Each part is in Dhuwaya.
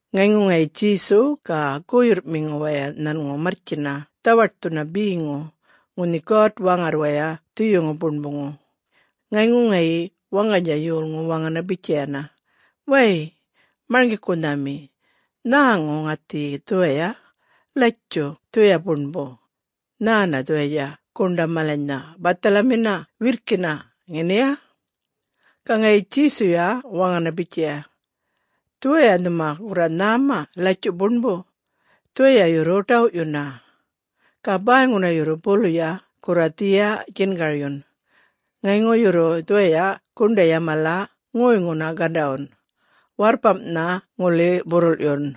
Ŋayŋu ŋayi Djesu ga guyurrꞌmiŋu waya nhanŋu marrtjina dhawaṯthuna beŋu ŋunhi God-Waŋarrwaya Dhuyuŋu Buṉbuŋu. Ŋayŋu ŋayi waŋganydja yolŋu waŋana bitjayana, “Way Marŋgikunhami, nhäŋu ŋäthiyi dhuwaya, latjuꞌ dhuwaya buṉbu. Nhäna dhuwayatja guṉḏa malanynha bathalamina wirrkina, ŋeniya?” Ga ŋayi Djesuya waŋana bitjaya, “Dhuwaya nhuma gurra nhäma latjuꞌ buṉbu, dhuwaya yurru ḏawꞌyuna. Ga bäyŋuna yurru buluya gurra dhiya djingaryun. Ŋayŋu yurru dhuwaya guṉḏaꞌya mala ŋoyŋuna gandawyun. Warrpamꞌnha ŋuli burruḻꞌyun.”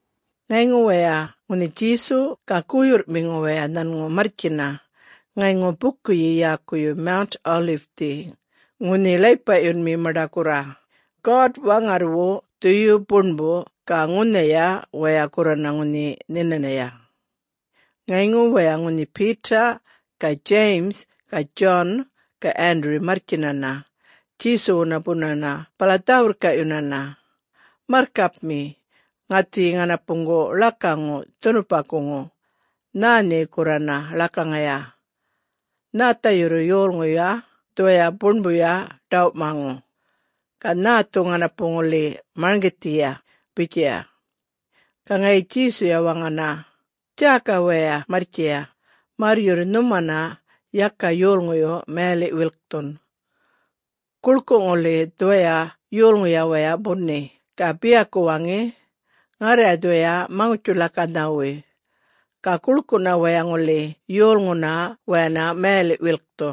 Ŋayŋu waya ŋunhi Djesu ga guyurrꞌmiŋu waya nhanŋu marrtjina ŋayŋu bukuyi yäkuyi Mount Olive-thi ŋunhi ḻaypaꞌyunmi maṉḏa gurra, God-Waŋarrwu Dhuyu Buṉbu ga ŋunhaya, waya gurrana ŋunhi nhinanaya. Ŋayŋu waya ŋunhi Peter ga James ga John ga Andrew marrtjinana Djesuwuna bunana bala dhä-wirrkaꞌyunana, “Marrkapmi, ŋäthiyi ŋanapuŋgu ḻakaŋu dhunupakuŋu, nhä nhe gurrana ḻakaŋaya. Nhätha yurru yolŋuyuya dhuwaya buṉbuya ḏawꞌmaŋu, ga nhäthu ŋanapu ŋuli marŋgithiya?” bitjaya. Ga ŋayi Djesuya waŋana, “Djäka waya marrtjiya märr yurru nhumana yaka yolŋuyu mayaliꞌ-wilkthun. Guḻkuꞌ ŋuli dhuwaya yolŋuya waya buni ga biyaku waŋi, ‘Ŋarra dhuwaya Maŋutji-ḻakanhawuya,’ ga guḻkuꞌna waya ŋuli yolŋuna wayana mayaliꞌ-wilkthu.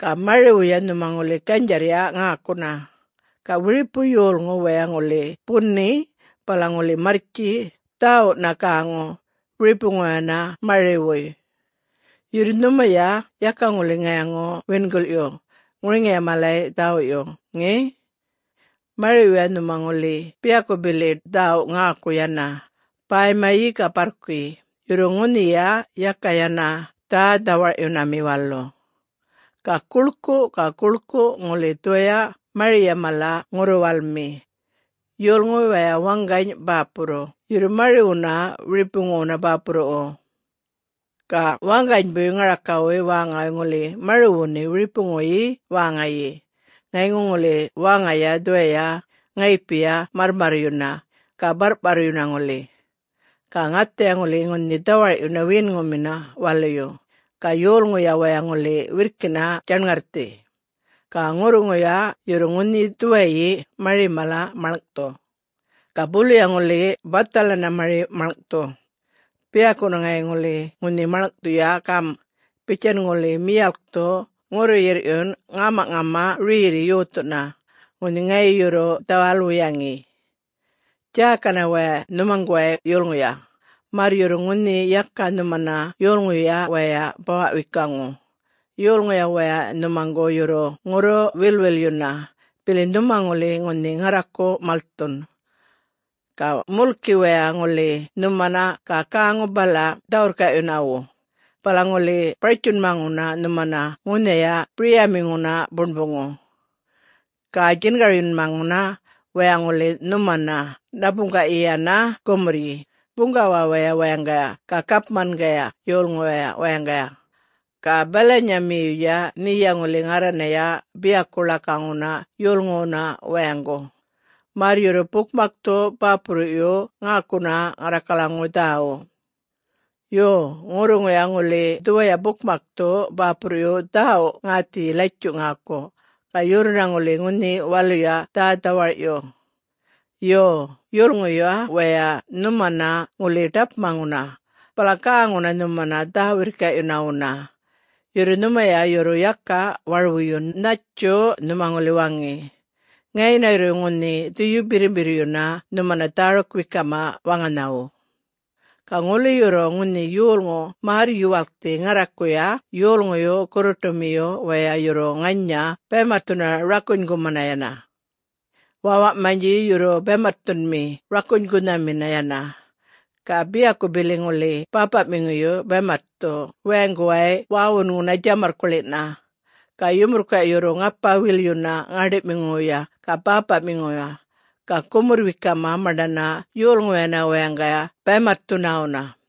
Ga mariwuya nhuma ŋuli ganydjarrya ŋäkuna. Ga wiripu yolŋu waya ŋuli buni bala ŋuli marrtji dhäwuꞌna-gäŋu wiripuwuynha mariwuy. Yurru nhumaya yaka ŋuli ŋayaŋu-wingilꞌyu ŋuriŋiya malay dhäwuꞌyu, ŋe? Mariwuyya nhuma ŋuli biyaku bili dhäwuꞌ ŋäku yana, bäymayi ga barrkuyi, yurru ŋunhiya yaka yana dhä-dhawaryunami walu. Ga guḻkuꞌ ga guḻkuꞌ ŋuli dhuwaya mariya mala ŋurru-walmi. Yolŋu waya waŋgany bäpurruꞌ yurru mari-wuna wiripuŋuwu bäpurruꞌwu. Ga waŋganybuy ŋarakawuy wäŋawuy ŋuli mariwuni wiripuŋuyi wäŋayi. Ŋayŋu ŋuli wäŋaya dhuwaya ŋayipiya marrmarryuna, ga barrꞌparryuna ŋuli. Ga ŋathaya ŋuli ŋunhi dhawarꞌyuna wiyinŋumina waluyu, ga yolŋuya waya ŋuli wirrkina djaṉŋarrthi. Ga ŋurruŋuya yurru ŋunhi dhuwayi mari mala maḻŋꞌthu. Ga buluya ŋuli bathalana mari maḻŋꞌthu. Beyaku ŋayi ŋuli ŋunhi maḻŋꞌthuya gam: Bitjan ŋuli miyalkthu ŋurru-yirrꞌyun ŋämaꞌŋama rerri yothuna ŋunhi ŋayi yurru dhawal-wuyaŋi. Djäkana waya nhumaŋguway yulŋuya, märr yurru ŋunhi yaka nhumana yolŋuyuya wayay bawaꞌ-wekuŋu. Yolŋuya waya nhumaŋgu yurru ŋurru-wilꞌwilyuna bili nhuma ŋuli ŋunhi ŋarraku malthun. Ga mulki waya ŋuli nhumana ga gäŋu bala dhä-wirrkaꞌyunawuna, bala ŋuli bartjunmaŋuna nhumana ŋunhaya biryamiŋuna buṉbuŋu. Ga djingaryunmaŋu waya ŋuli nhumana ṉapuŋgaꞌyi yana gumurryi buŋgawawaya wayaŋgaya ga gapmangaya yolŋuwaya wayaŋgaya. Ga balanyamiyuya nheya ŋuli ŋarranaya biyaku ḻakaŋuna yolŋuwuna wayaŋgu, märr yurru bukmakthu bäpurruꞌyu ŋäkuna ŋarrakalaŋuwuy dhäwuꞌ. Yo, ŋurruŋuya ŋuli dhuwaya bukmakthu bäpurruꞌyu dhäwuꞌ ŋäthiyi latjuꞌ ŋäku, ga yurruna ŋuli ŋunhi waluya dhä-dhawarꞌyu. Yo, yolŋuyuya wayay nhumana ŋuli ḏapmaŋuna bala gäŋuna nhumana dhä-wirrkaꞌyunawuna, yurru nhumaya yurru yaka warwuyun nhattju nhuma ŋuli waŋi. Ŋayina yurru ŋunhi Dhuyu Birrimbirryuna nhumana dhäruk-wekama waŋanhawu. Ga ŋuli yurru ŋunhi yolŋu märr-yuwalkthi ŋarrakuya, yolŋuyu gurruṯumiyu wayay yurru ŋanya baymatthuna rakunygumana yana. Wäwaꞌmanydji yurru baymatthunmi rakunygunhamina yana. Ga biyaku bili ŋuli bäpaꞌmiŋuyu baymatthu wayaŋguway wäwunŋuna djamarrkuḻina. Ga yumurrkuꞌya yurru ŋapa-wilyuna ŋäṉḏiꞌmiŋuwu ga bäpaꞌmiŋuwu ga gumurr-wekama maṉḏana yolŋuwayana wayaŋgaya baymatthunawu.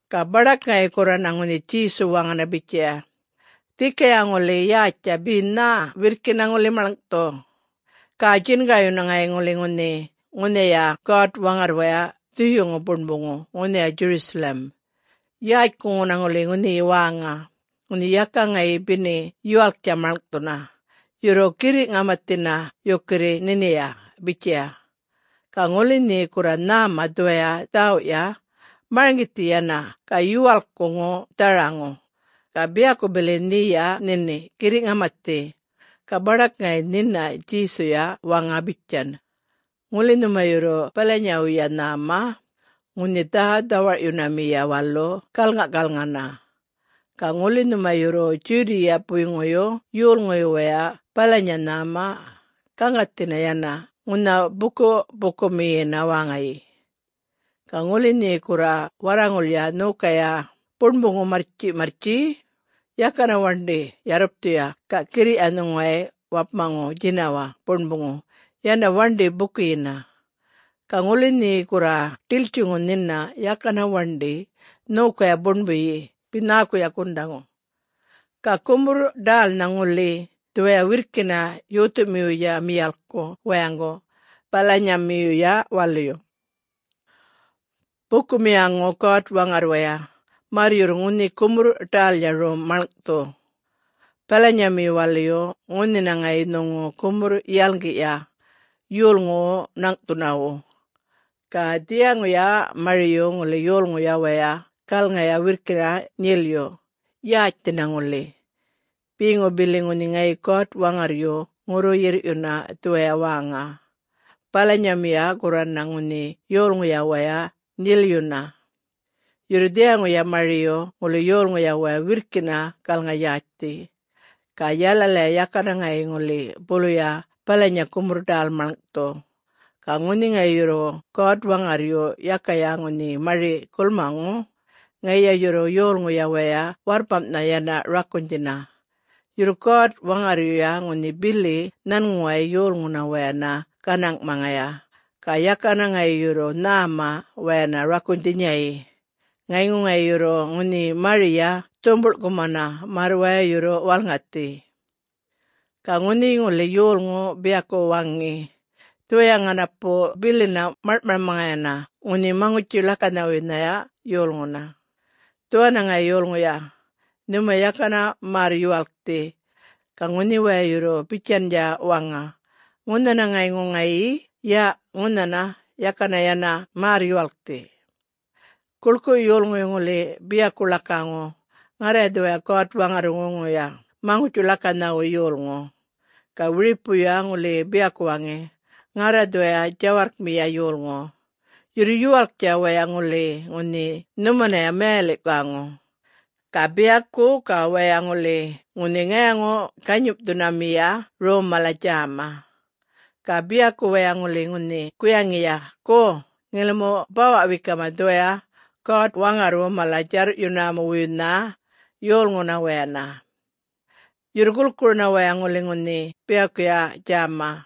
Ga baḏak ŋayi gurrana ŋunhi Djesu waŋana bitjaya, “Dhikaya ŋuli yätjtja be nhä wirrkina ŋuli maḻŋꞌthu. Ga djingaryuya ŋayi ŋuli ŋunhi ŋunhaya God-Waŋarrwaya Dhuyuŋu Buṉbuŋu ŋunhaya Jerusalem, yätjkuŋuna ŋuli ŋunhiya wäŋa, ŋunhi yaka ŋayi beni yuwalktja maḻŋꞌthuna. Yurru, girriꞌ-ŋamathina yukirri nhiniya,” bitjaya. (Ga ŋuli nhe gurra nhäma dhuwaya dhäwuꞌya, marŋgithi yana ga yuwalkkuŋu dharaŋu, ga biyaku bili nheya nhini girriꞌ-ŋamathi.) Ga baḏak ŋayi nhina Djesuya waŋa bitjan, “Ŋuli nhuma yurru balanyawuya nhäma, ŋunhi dhä-dhawarꞌyunamiya walu galŋaꞌkalŋana. Ga ŋuli nhuma yurru Judea-puyŋuyu yolŋuyu wayay balanya nhäma, gaŋgathina yana ŋunha bukuꞌ-pukumiyina wäŋayi. Ga ŋuli nhe gurra warraŋulya nhokaya buṉbuŋu marrtjiꞌmarrtji, yakana waṉḏi yarrupthuya ga girriꞌya nhuŋuway wapmaŋu djinawaꞌ buṉbuŋu yana waṉḏi bukuyina. Ga ŋuli nhe gurra ḏiltjiŋuya nhina, yakana waṉḏi nhokaya buṉbuyi be nhäkuya gundhaŋu. Ga gumurr-ḏälnha ŋuli dhuwaya wirrkina yothumiwuya miyalkku wayaŋgu balanyamiyuya waluyu. Bukumiyaŋu God-Waŋarrwaya, märr yurru ŋunhi gumurr-ḏälya rom maḻŋꞌthu, balanyamiyu waluyu ŋunhina ŋayi nhuŋu gumurr-yalŋgiꞌya yolŋuwu ṉaŋꞌthunawu. Ga dhiyaŋuya mariyu ŋuli yolŋuya waya galŋaya wirrkina nyelyu, yätjthina ŋuli. Beŋu bili ŋunhi ŋayi God-Waŋarryu ŋurru-yirrꞌyuna dhuwaya wäŋa, balanyamiyu gurrana ŋunhi yolŋuya waya nyelyuna. Yurru dhiyaŋuya mariyu ŋuli yolŋuya waya wirrkina galŋa-yätjthi. Ga yalalaya yakana ŋayi ŋuli buluya balanya gumurr-ḏäl maḻŋꞌthu. Ga ŋunhi ŋayi yurru God-Waŋarryu yakaya ŋunhi mari gulmaŋu, ŋayiya yurru yolŋuya waya warrpamꞌnha yana rakunydhina. Yurru God-Waŋarryuya ŋunhi bili nhanŋuway yolŋuna wayana ganaŋꞌmaŋaya, ga yakana ŋayi yurru nhäma wayana rakunydhinyayi, ŋayŋu ŋayi yurru ŋunhi mariya dhumbuḻkumana, märr waya yurru walŋathi. Ga ŋunhi ŋuli yolŋu biyaku waŋi, ‘Dhuwaya ŋanapu bilina maḻŋꞌmaŋayana ŋunhi Maŋutji-ḻakanhawuynhaya yolŋuna, dhuwana ŋayi yulŋuya,’ nhumaya yakana märr-yuwalkthi. Ga ŋunhi waya yurru bitjandja waŋa, ‘Ŋunhana ŋayŋu ŋayi, ya ŋunhana,’ yakana yana märr-yuwalkthi. Guḻkuꞌyu yolŋuyu ŋuli biyaku ḻakaŋu, ‘Ŋarra dhuwaya God-Waŋarrwuŋuya Maŋutji-ḻakanhawuy yolŋu.’ Ga wiripuya ŋuli biyaku waŋi, ‘Ŋarra dhuwaya djawarrkmiya yolŋu,’ yurru yuwalktja waya ŋuli ŋunhi nhumanaya mayaliꞌ-gäŋu. Ga biyaku ga waya ŋuli ŋunhi ŋayaŋu-ganyimꞌthunamiya rom mala djäma. Ga biyaku waya ŋuli ŋunhi guyaŋiya, ‘Go, ŋilimu bawa-wekama dhuwaya God-Waŋarrwu mala-djarrꞌyunawuynha yolŋuna wayana.’ Yurru gulkuruna waya ŋuli ŋunhi biyakuya djäma.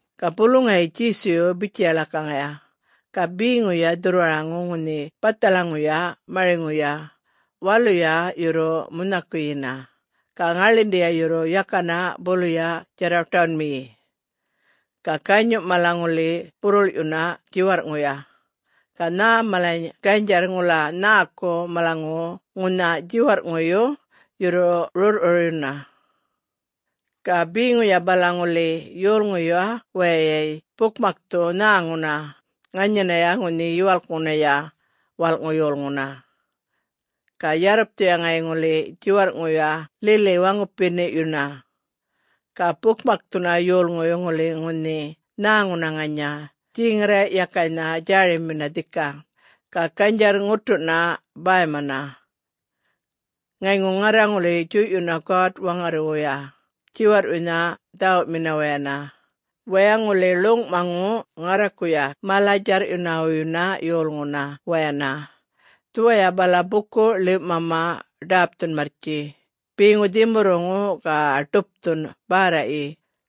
Ga bulu ŋayi Djesuyu bitjaya ḻakaŋaya, “Ga beŋuya dhurrwaraŋu ŋunhi bathalaŋuya mariŋuya, waluya yurru munhaꞌkuyina ga ŋaḻinḏiya yurru yakana buluya djarraṯawunꞌmiyi. Ga ganyuꞌya mala ŋuli burrulꞌyuna djiwarrꞌŋuya ga nhä malany ganydjarr ŋula nhäku malaŋuwu ŋunha djiwarrꞌŋuyu yurru rurrꞌrurryuna. Ga beŋuya bala ŋuli yolŋuyuya wayay bukmakthu nhäŋuna ŋanyanaya ŋunhi Yuwalkŋunaya Walꞌŋu Yolŋuna. Ga yarrupthuya ŋayi ŋuli djiwarrꞌŋuya lili waŋupiniꞌyuna. Ga bukmakthu yolŋuyu ŋuli ŋunhi nhäŋuna ŋanya djeŋarraꞌyakaynha djärimina dhika, ga ganydjarr-ŋutuꞌna bäymana. Ŋayŋu ŋarra ŋuli djuyꞌyuna God-Waŋarrwuya djiwarrꞌwuynha dhäwuꞌmina wayana, waya ŋuli ḻuŋꞌmaŋu ŋarrakuya mala-djarrꞌyunawuynha yolŋuna wayana dhuwaya bala buku-ḻiwꞌmama ḏapthun marrtji, beŋu dhimurruŋu ga ḏupthun bärraꞌyi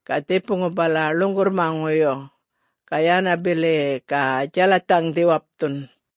ga dhipuŋu bala ḻuŋgurrmaŋuyu ga yana bili ga djalathaŋdhi wapthun.”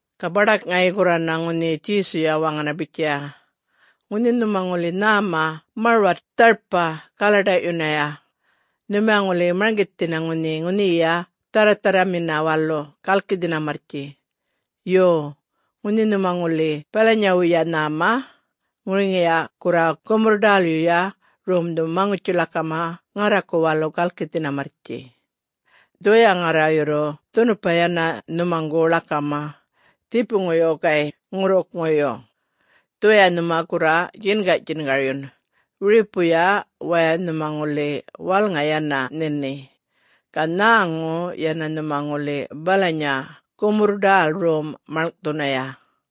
Ga baḏak ŋayi gurrana ŋunhi Djesuya waŋana bitjaya, “Ŋunhi nhuma ŋuli nhäma marwat dharpa galaḏaꞌyunaya, nhumaya ŋuli marŋgithina ŋunhi ŋunhiya dharratharramina walu galkithina marrtji. Yo, ŋunhi nhuma ŋuli balanyawuya nhäma, ŋuriŋiya gurra gumurr-ḏälyuya romdhu maŋutji-ḻakama ŋarraku walu galkithina marrtji. Dhuwaya ŋarra yurru dhunupa yana nhumaŋgu ḻakama! Dhipuŋuyu gayꞌ ŋurrukŋuyu, dhuwaya nhuma gurra djingaꞌdjingaryun, wiripuya waya nhuma ŋuli walŋa yana nhini, ga nhäŋu yana nhuma ŋuli balanya gumurr-ḏäl rom maḻŋꞌthunaya.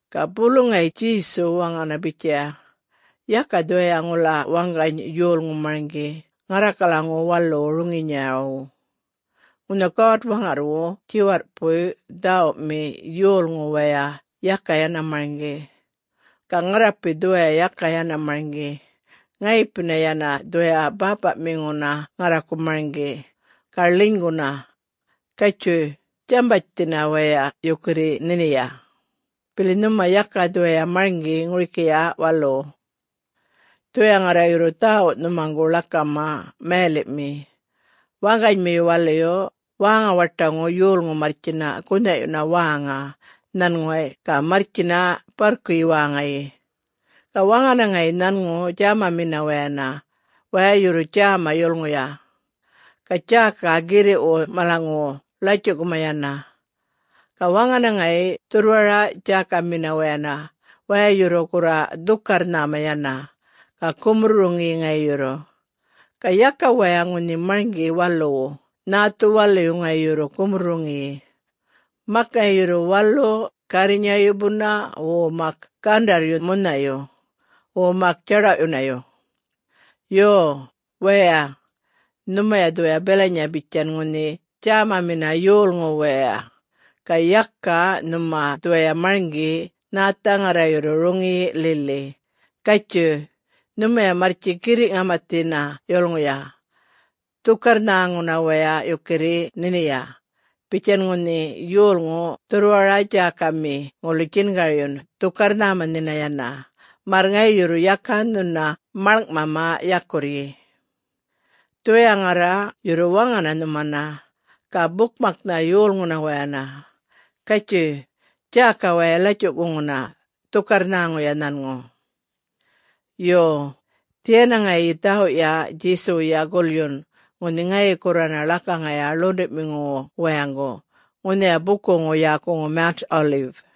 Ga bulu ŋayi Djesu waŋana bitjaya, “Yaka dhuwaya ŋula waŋgany yolŋu marŋgi ŋarrakalaŋuwu waluwu roŋiyinyawu. Ŋunha God-Waŋarrwu djiwarrꞌpuy dhäwuꞌmi yolŋu waya yaka yana marŋgi. Ga ŋarrapi dhuwaya yaka yana marŋgi. Ŋayipina yana dhuwaya Bäpaꞌmiŋuna ŋarraku marŋgi, ga ḻinyguna. Gatjuy, djambatjthina waya yukurri nhiniya, bili nhuma yaka dhuwaya marŋgi ŋurikiya waluwu. Dhuwaya ŋarra yurru dhäwuꞌ nhumaŋgu ḻakama mayaliꞌmi: Waŋganymiyu waluyu wäŋa-waṯaŋu yolŋu marrtjina gunhaꞌyuna wäŋa nhanŋuway ga marrtjina barrkuyi wäŋayi. Ga waŋana ŋayi nhanŋu djämamina wayana, waya yurru djäma yulŋuya, ga djäka girriꞌwu malanyŋuwu latjuꞌkuma yana. Ga waŋana ŋayi dhurrwara-djäkamina wayana waya yurru gurra dhukarr-nhäma yana, ga gumurr-roŋiyi ŋayi yurru. Ga yaka waya ŋunhi marŋgi waluwu, nhäthu waluyu ŋayi yurru gumurr-roŋiyi. Mak ŋayi yurru walu gärrinyayu buna wo mak gandarryu munhayu, wo mak djaḏawꞌyunayu. Yo, waya, nhumaya dhuwaya balanya bitjan ŋunhi djämamina yolŋu waya, ga yaka nhuma dhuwaya marŋgi nhätha ŋarra yurru roŋiyi lili. Gatjuyꞌ, nhumaya marrtji girriꞌ-ŋamathina yulŋuya. Dhukarr-nhäŋuna waya yukirri nhiniya, bitjan ŋunhi yolŋu dhurrwara-djäkami ŋuli djingaryun dhukarr-nhäma nhina yana, märr ŋayi yurru yaka nhuna maḻŋꞌmama yakurryi. Dhuwaya ŋarra yurru waŋana nhumana, ga bukmaknha yolŋuna wayana, ‘Gatjuy, djäka waya latjuꞌkuŋuna, dhukarr-nhäŋuya nhanŋu.’” [Yo, dhiyana ŋayi dhäwuꞌya Djesuwuya gulyun ŋunhi ŋayi gurrana ḻakaŋaya ḻuṉḏuꞌmiŋuwu wayaŋgu ŋunhaya bukuŋu yäkuŋu Mount Olive.]